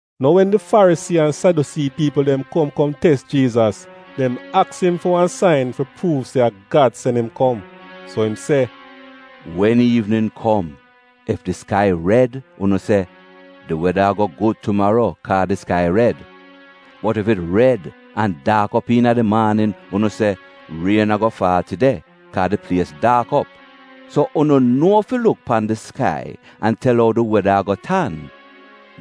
Nou wen di Farisii an Sadyusii piipl dem kom kom tes Jiizas, dem aks im fi wan sain fi pruuv se a Gad sen im kom. So im se, “Wen iivnin kom ef di skai red unu se, ‘Di weda a-go gud tumaro kaa di skai red’ Bot ef it red an daak op iina di maanin, unu se, ‘Rien a-go faal tide, kaa di plies daak op.’ So unu nuo fi luk pan di skai an tel ou di weda a-go tan.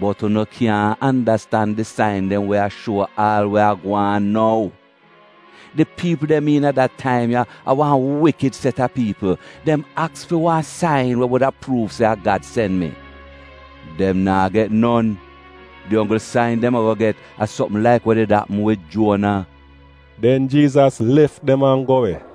Bot unu kyaahn andastan di sain dem we a shuo aal we a gwaan nou. Di piipl dem iina da taim ya, a wan wikid set a piipl. Dem aks fi wan sain we wuda pruuv se a Gad sen mi. Dem naa get non! Di onggl sain dem a-go get a sopm laik we did apm wid Juona.” Den Jiizas lef dem an go we.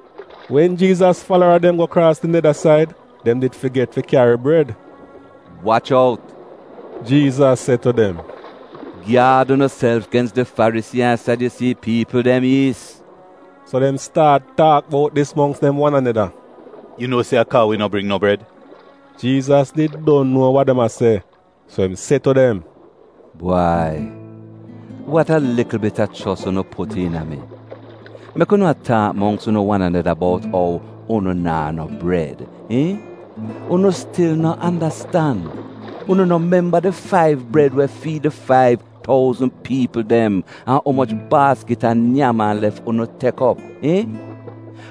Wen Jiizas falara dem go kraas di neda said, dem did figet fi kyari bred. “Wach out!,” Jiizas se tu dem. “Gyaad unuself gens di Farisii an Sadyusii piipl dem yiis.” So dem staat taak bout dis mongks dem wan aneda, “Yu nuo se a kaa wi no bring no bred.” Jiizas did don nuo wa dem a se, so im se tu dem, “Bwai, wat a likl bit a chos unu put iina mi! Mek unu a taak mongks unu wan aneda bout ou unu naa no bred, iihn? Unu stil no andastan? Unu no memba di faiv bred we fiid di faiv touzn piipl dem an umoch baaskit a nyam-an-lef unu tek op, iihn?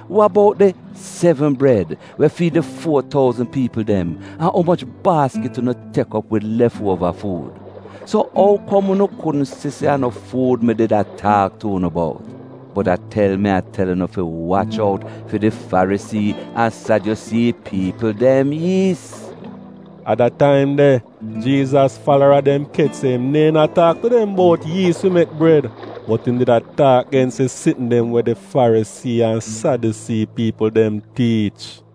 Wa bout di sevn bred we fiid di fuo touzn piipl dem an umoch baaskit unu tek op wid lef-uova fuud? So ou kom unu kudn si se a no fuud mi did a taak tu unu bout? Bot a tel mi a tel unu fi wach out fi di Farisii an Sadyusii piipl dem yiis!” A da taim de Jiizas falara dem kech se im neehn a taak tu dem bout yiis fi mek bred, bot im did a taak gens di sitn dem we di Farisii an Sadyusii piipl dem tiich.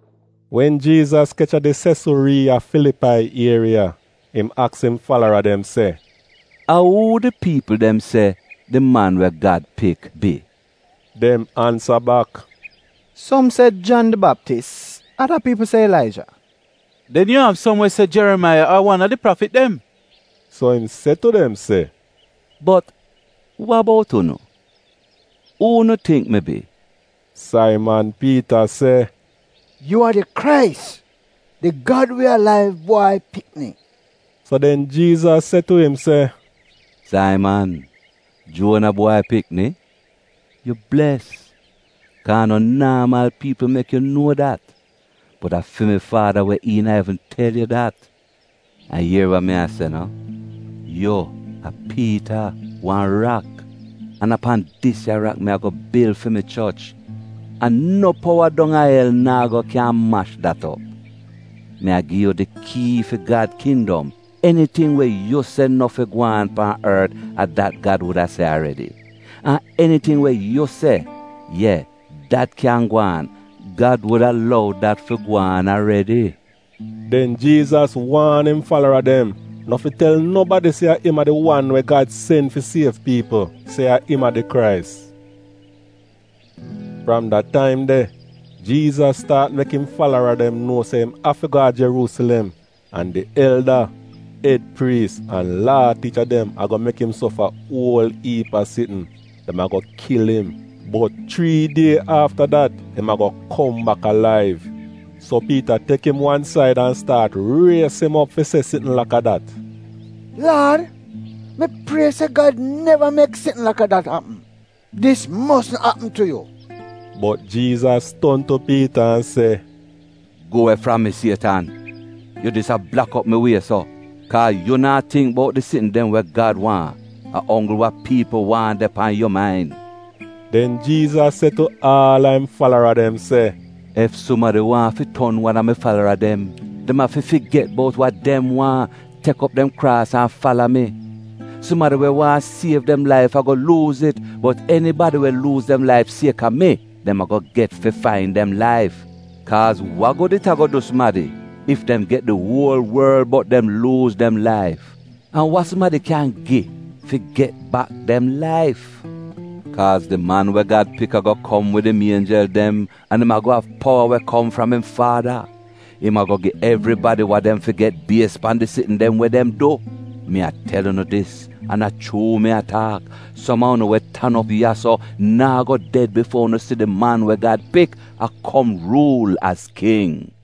Wen Jiizas kech a di Sesuriiya Filipai ieriya, im aks im falara dem se, “A uu di piipl dem se di Man we Gad Pik bi?” Dem ansa bak, “Som se Jan di Baptis, ada piipl se Ilaija, den yu av som we se Jerimaiya ar wan a di prafit dem.” So im se tu dem se, “Bot wa bout unu? Uu unu tingk mi bi?” Saiman Piita se, “Yu a di Krais, di Gad we alaiv Bwai Pikni.” So den Jiizas se tu im se, “Saiman, Juona bwai pikni, yu bles, kaa a no naamal piipl mek yu nuo dat, bot a fi mi Faada we iina evn tel yu dat! An ier wa mi a se no, yu a Piita, wan rak. An a pan dis ya rak mi a-go bil fi mi choch, an no powa dong a el naa go kyan mash dat op. Mi a-go gi yu di kii fi Gad kindom. Eniting we yu se no fi gwaan pan ort a dat Gad wuda se aredi. An eniting we yu se: ye, dat kyan gwaan, Gad wuda lou dat fi gwaan aredi.” Den Jiizas waan im falara dem no fi tel nobadi se a im a di wan we Gad sen fi siev piipl — se a im a di Krais. Fram da taim de, Jiizas staat mek im falara dem nuo se im afi go a Jeruusilem, an di elda, ed priis an Laa tiicha dem a-go mek im sofa uol iip a sitn. Dem a-go kil im, bot chrii die afta dat im a-go kom bak alaiv. So Piita tek im wan said an staat ries im op fi se sitn laka dat: “Laad, mi prie se Gad neva mek sitn laka dat apm! Dis mosn apm tu yu!” Bot Jiizas ton tu Piita an se, “Gu we fram mi Sietan! Yu dis a blak op mi wie so, kaa yu naa tingk bout di sitn dem we Gad waahn; a onggl wa piipl waahn de pan yu main!” Den Jiizas se tu aal a im falara dem se, “Ef sumadi waahn fi ton wan a mi falara dem, dem afi figet bout wa dem waahn, tek op dem kraas an fala mi. Sumadi we waahn siev dem laif a-go luuz it, bot enibadi we luuz dem laif siek-a mi, dem a-go get fi fain dem laif. Kaaz wa gud it a-go du sumadi ef dem get di uol worl bot dem luuz dem laif? An wa sumadi kyan gi fi get bak dem laif? Kaaz di Man we Gad Pik a-go kom wid im ienjel dem an im a-go av powa we kom fram im Faada. Im a-go gi evribadi wa dem fi get bies pan di sitn dem we dem du. Mi a tel unu dis, an a chuu mi a taak, som a unu we tan op ya-so naa go ded bifuo unu si di Man we Gad Pik a kom ruul az king.”